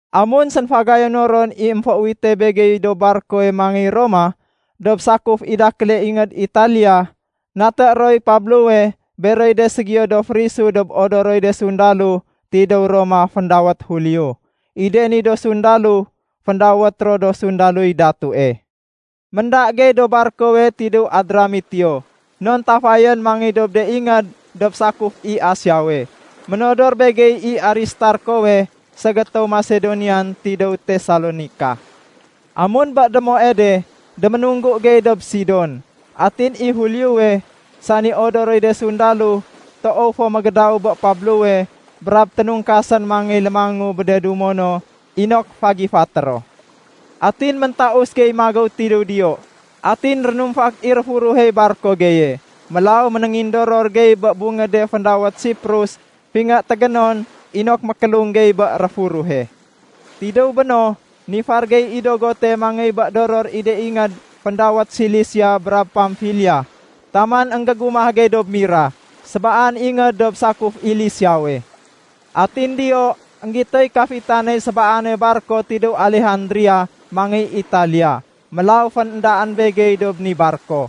Amun sénfagayuno ron i émféuwite begey dob barkowe mangéy Roma dob sakuf i dakéle ingéd Italiya, naté roy ro Pablowe beroy de ségiyo do férisu dob odoroy de sundalo tidéw Roma féndawét Julio. I de ni do sundalo, féndawét ro “Do sundaloy Datue”. Ménda gey dob barkowe tidéw Adramitio, non tafayén mangéy dob de ingéd dob sakuf i Asiawe. Ménodor begey i Aristarkowe ségétéw Masedonian tidéw Tesalonika. Amun bé démoe de déménunggu gey dob Sidon. Atin i Juliowe, sani odoroy de sundalo, toow fo mégédaw bé Pablowe brab ténungkasén mangéy lémangu bé de dumo no inok fagifaté ro. Atin méntaus gey magéw tidéw diyo. Atin rénumfak i réfuruhey barko geye, mélaw ménéngindoror gey bé bungéde féndawét Siprus fingé tégénon inok mékélung gey bé réfuruhe. Tidéw béno, nifar gey i dogote mangéy bé doror i de ingéd féndawét Silisia brab Pamfilia taman énggégumah gey dob Mira, sébaan ingéd dob sakuf i Lisiawe. Atin diyo énggitoy kafitaney sébaane barko tidéw Alejandria mangéy Italia, mélaw féndaén begey dob ni barko.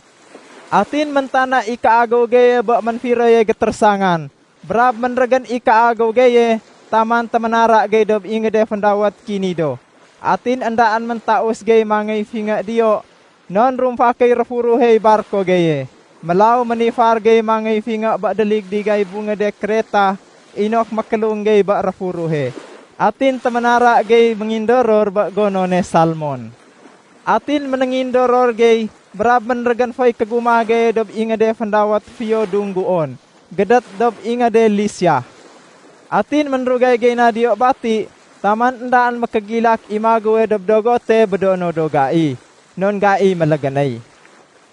Atin méntana i kéagéw geye bé ménfiroye gétérésangan brab ménrégén i kéagéw geye taman téménara gey dob ingéde féndawét Kinido. Atin éndaén méntaus gey mangéy fingé diyo non rumfakéy réfuruhey barko geye. Mélaw ménifar gey mangéy fingé bé déligdigay bungéde Kreta inok mékélung gey bé réfuruhe. Atin téménara gey méngindoror bé gonone Salmon. Atin ménéngindoror gey brab ménrégén foy kégumah geye dob ingéde féndawét “Fiyo Dungguon” gédét dob ingéde Lisia. Atin ménrugay gey na diyo bati taman éndaén mékégilak i magéwe dob dogote bé do no do gai non gai mélégénéy.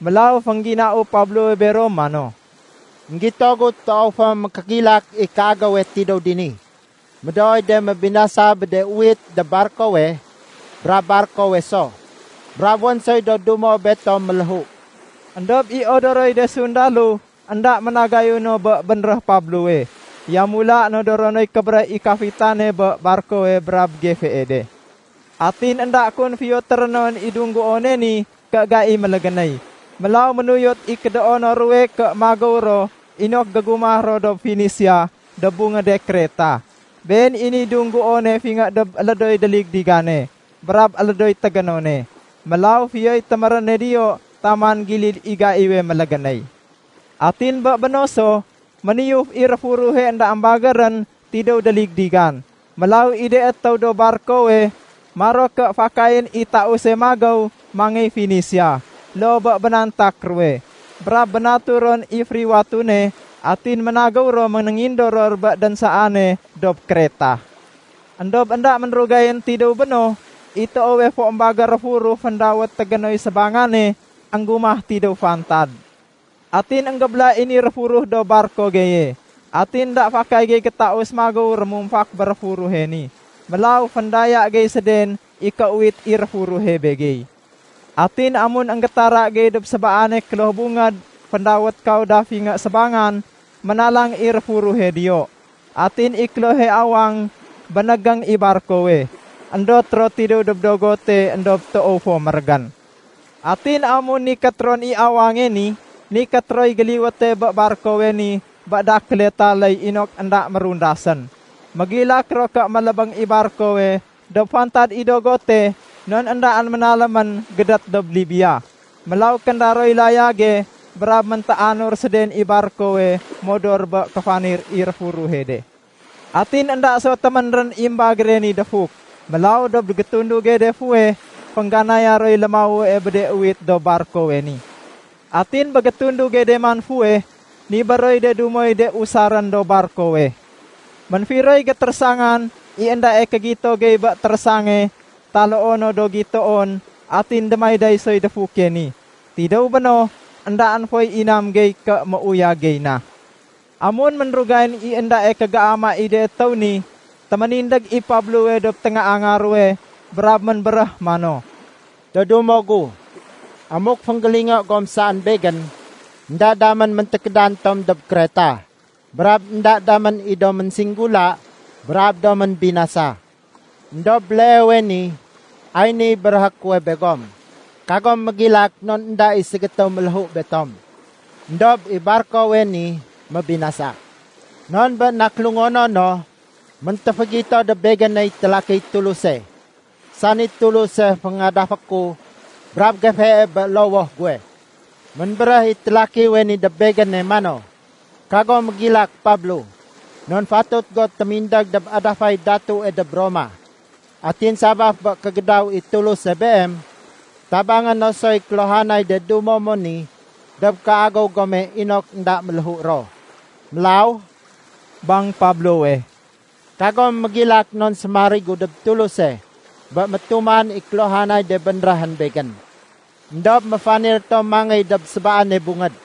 Mélaw féngginau Pablowe bero mano, “Enggito gu toow fo mékégilak i kéagéwe tidéw dini. Médooy de mébinasa bé de uwit dob barkowe brab barkowe so. Brab wén soy do dumo betom méléhu.” Endob i odoroy de sundalo énda ménagayu no bé bénréh Pablowe, yamula nodoro noy kébéréh i kafitane bé barkowe brab gefee de. Atin énda kun fiyo térénon i dungguone ni ké gai mélégénéy. Mélaw ménuyot i kédoono ruwe ké magéw ro inok gégumah ro dob Fenisia dob bungéde Kreta. Been i niy dungguone fingé dob élédoy déligdigane brab élédoy tégénone. Mélaw fiyoy téméréne diyo taman gilid i gaiwe mélégénéy. Atin bé béno so, méniyuf i réfuruhe énda émbagérén tidéw déligdigan. Mélaw i de étéw dob barkowe maro ké fakayén i tause magéw mangéy Fenisia, loo bé bénantak ruwe. Brab bénatu ron i fériwatune atin ménagéw ro ménéngindoror bé dénsaane dob Kreta. Endob énda ménrugayén tidéw béno, i toowe fo émbagér réfuruh féndawét “Tégénoy Sébangane” énggumah tidéw fantad. Atin énggébéla i ni réfuruh dob barko geye. Atin énda fakay gey gétaus magéw rémumfak bé réfuruhe ni. Mélaw féndaya gey séden i kéuwit i réfuruhe begey. Atin amun énggétara gey dob sébaane kloh bungéd féndawét Kauda fingé sébangan, ménalang i réfuruhe diyo. Atin i klohe awang bénégéng i barkowe, éndot ro tidéw dob dogote éndob toow fo mérégén. Atin amun ténaléy ron i awange ni, nikét roy géliwéte bé barkowe ni bé de dakél taléy inok énda mérundasén. Mégilak ro ké mélébéng i barkowe dob fantad i dogote non éndaén ménalémén gédét dob Libia. Mélaw kénda roy layage brab méntéanur séden i barkowe modor bé kéfanir i réfuruhe de. Atin énda so téménrén i émbagére ni défuk. Mélaw dob gétunduge de fuweh féngganaya roy lémawue bé de uwit dob barkowe ni. Atin bé gétunduge de man fuweh nibér roy de dumoy de usarén dob barkowe. Ménfiroy gétérésangan, i éndae kégito gey bé térésange taloo no do gitoon atin démayday soy défuke ni. Tidéw béno, éndaén foy inam gey ké méuyag gey na. Amun ménrugayén i éndae kégéama i de étéw ni, téménindég i Pablowe dob téngaanga ruwe brab ménbéréh mano, “Do dumo gu, amuk fénggélingo gom saén begén, énda damén méntékédan tom dob Kreta, brab énda damén i do ménsinggula brab do ménbinasa. Endob béleewe ni ay niy béréhé kuwe begom, kagom mégilak non énda i ségétéw méléhu betom. Endob i barkowe ni mébinasa. Non bé nakélungonono méntéfégito dob begéney télakiy Tuluse, sani Tuluse féngadafé ku brab gefee bé lowoh guwe. Ménbéréh i télakiwe ni dob begéne mano, ‘Kago mégilak Pablo! Non fatut go témindég dob adafay datue dob Roma. Atin sabaf bé kégédaw i Tuluse beem, tabangé no soy kéluhanay de dumo mo ni dob kéagéw gome inok énda méléhu ro.’ Mélaw,” bang Pablowe, “kagom mégilak non sémarigu dob Tuluse bé métuman i kéluhanay de bénréhén begén. Endob méfanir tom mangéy dob sébaane bungéd.”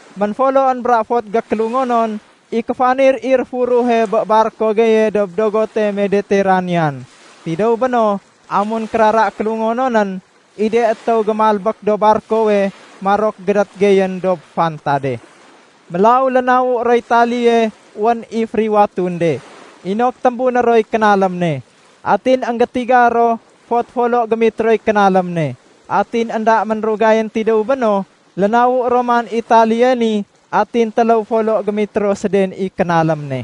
Ménfoloén bra fot gékélungonon i kéfanir i réfuruhe bé barko geye dob dogote Medeteranean. Tidéw béno amun kérara kélungononén, i de étéw gémalbék dob barkowe marok gédét geyén dob fantade. Mélaw lénawu roy taléye wén i fériwatun de, inok témbuné roy kénalém ne. Atin énggétiga ro fot folo gémitroy kénalém ne. Atin énda ménrugayén tidéw béno, lénawu ron man i taléye ni atin téléw folo gémitro séden i kénalém ne.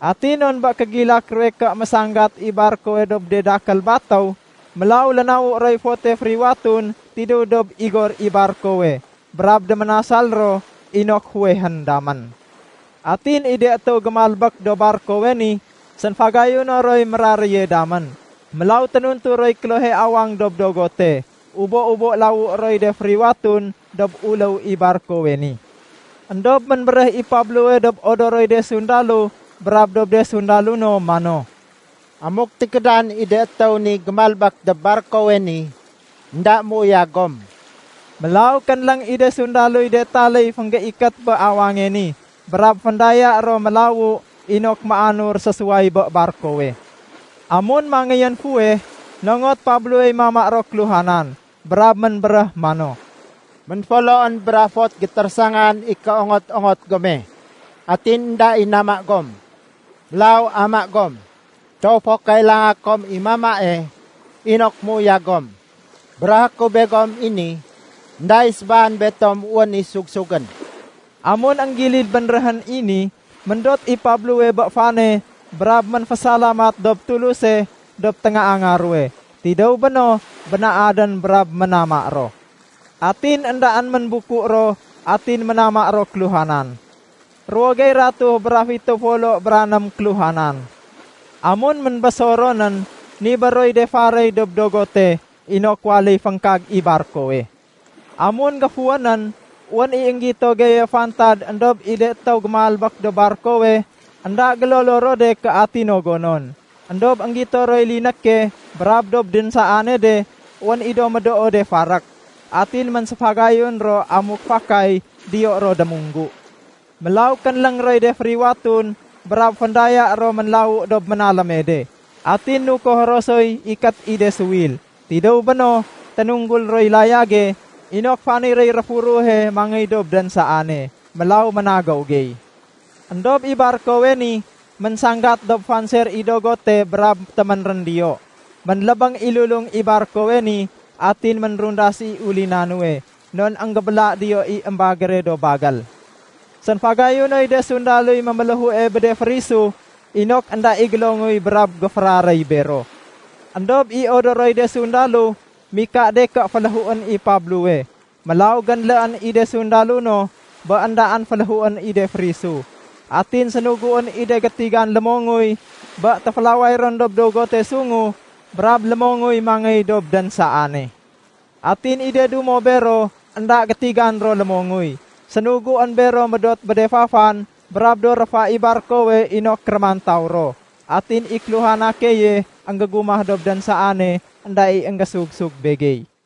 Atin non bé kégilak ruwe ké mésanggat i barkowe dob de dakél batéw, mélaw lénawu roy fote fériwatun tidéw dob igor i barkowe brab déménasal ro inok fuwehén damén. Atin i de étéw gémalbék dob barkowe ni sénfagayuno roy méraréye damén. Mélaw ténuntu roy klohe awang dob dogote. Ubo-ubo lawué roy de fériwatun dob uléw i barkowe ni. Endob ménbéréh i Pablowe dob odoroy de sundalo brab dob de sundalo no mano, “Amuk tékédan i de étéw ni gémalbék dob barkowe ni, énda méuyag gom.” Mélaw kénléng i de sundaloy de taléy fénggéikét bé awange ni brab féndaya ro mélawu inok méanur sésuway bé barkowe. Amun mangéyén fuweh, nongot Pablowey mama ro kéluhanan brab ménbéréh mano, “Ménfoloén bra fot gétérésangan i kéongot-ongot gome atin énda i nama gom. Mélaw ama gom! Toow fo kailanga kom i mamae inok méuyag gom. Béréhé ku begom i ni, énda i sébaan betom wén i sug-sugén.” Amun énggilid bénréhén i ni, méndot i Pablowe bé fane brab ménfésalamat dob Tuluse dob téngaanga ruwe. Tidéw béno bénaadén brab ménama ro. Atin éndaén ménbuku ro atin ménama ro kéluhanan. Ruwo gey ratuh bra fitéw folo bra ném kéluhanan. Amun ménbésor ronén, nibér roy de faréy dob dogote inok waléy féngkag i barkowe. Amun géfuwénén, wén i énggito geye fantad éndob i de étéw gémalbék dob barkowe, énda gélolo ro de ké ati no gonon. Endob énggito roy linéke brab dob dénsaane de wén i do médoo de farék. Atin ménséfagayun ro amuk fakay diyo ro démunggu. Mélaw kénléng roy de fériwatun brab féndaya ro ménlawu dob ménaléme de. Atin nukoh ro soy ikét i de suwil. Tidéw béno, ténunggul roy layage inok faniréy réfuruhe mangéy dob dénsaane. Mélaw ménagéw gey. Endob i barkowe ni ménsanggat dob fanser i dogote brab téménrén diyo. Ménlébéng i lulung i barkowe ni atin ménrundas i ulina nuwe non énggébéla diyo i émbagére do bagél. Sénfagayunoy de sundaloy méméléhue bé de férisu inok énda i gélonguy brab géféraréy bero. Endob i odoroy de sundalo mika de ké féléhuén i Pablowe. Mélaw génléén i de sundalo no bé éndaén féléhuén i de férisu. Atin sénuguén i de gétigan lémonguy bé téfélaway ron dob dogote sungu brab lémonguy mangéy dob dénsaane. Atin i de dumo bero énda gétigan ro lémonguy, sénuguén bero médot bé de fafan brab do réfa i barkowe inok rémantaw ro. Atin i kéluhana keye énggégumah dob dénsaane, énda i énggésug-sug begey.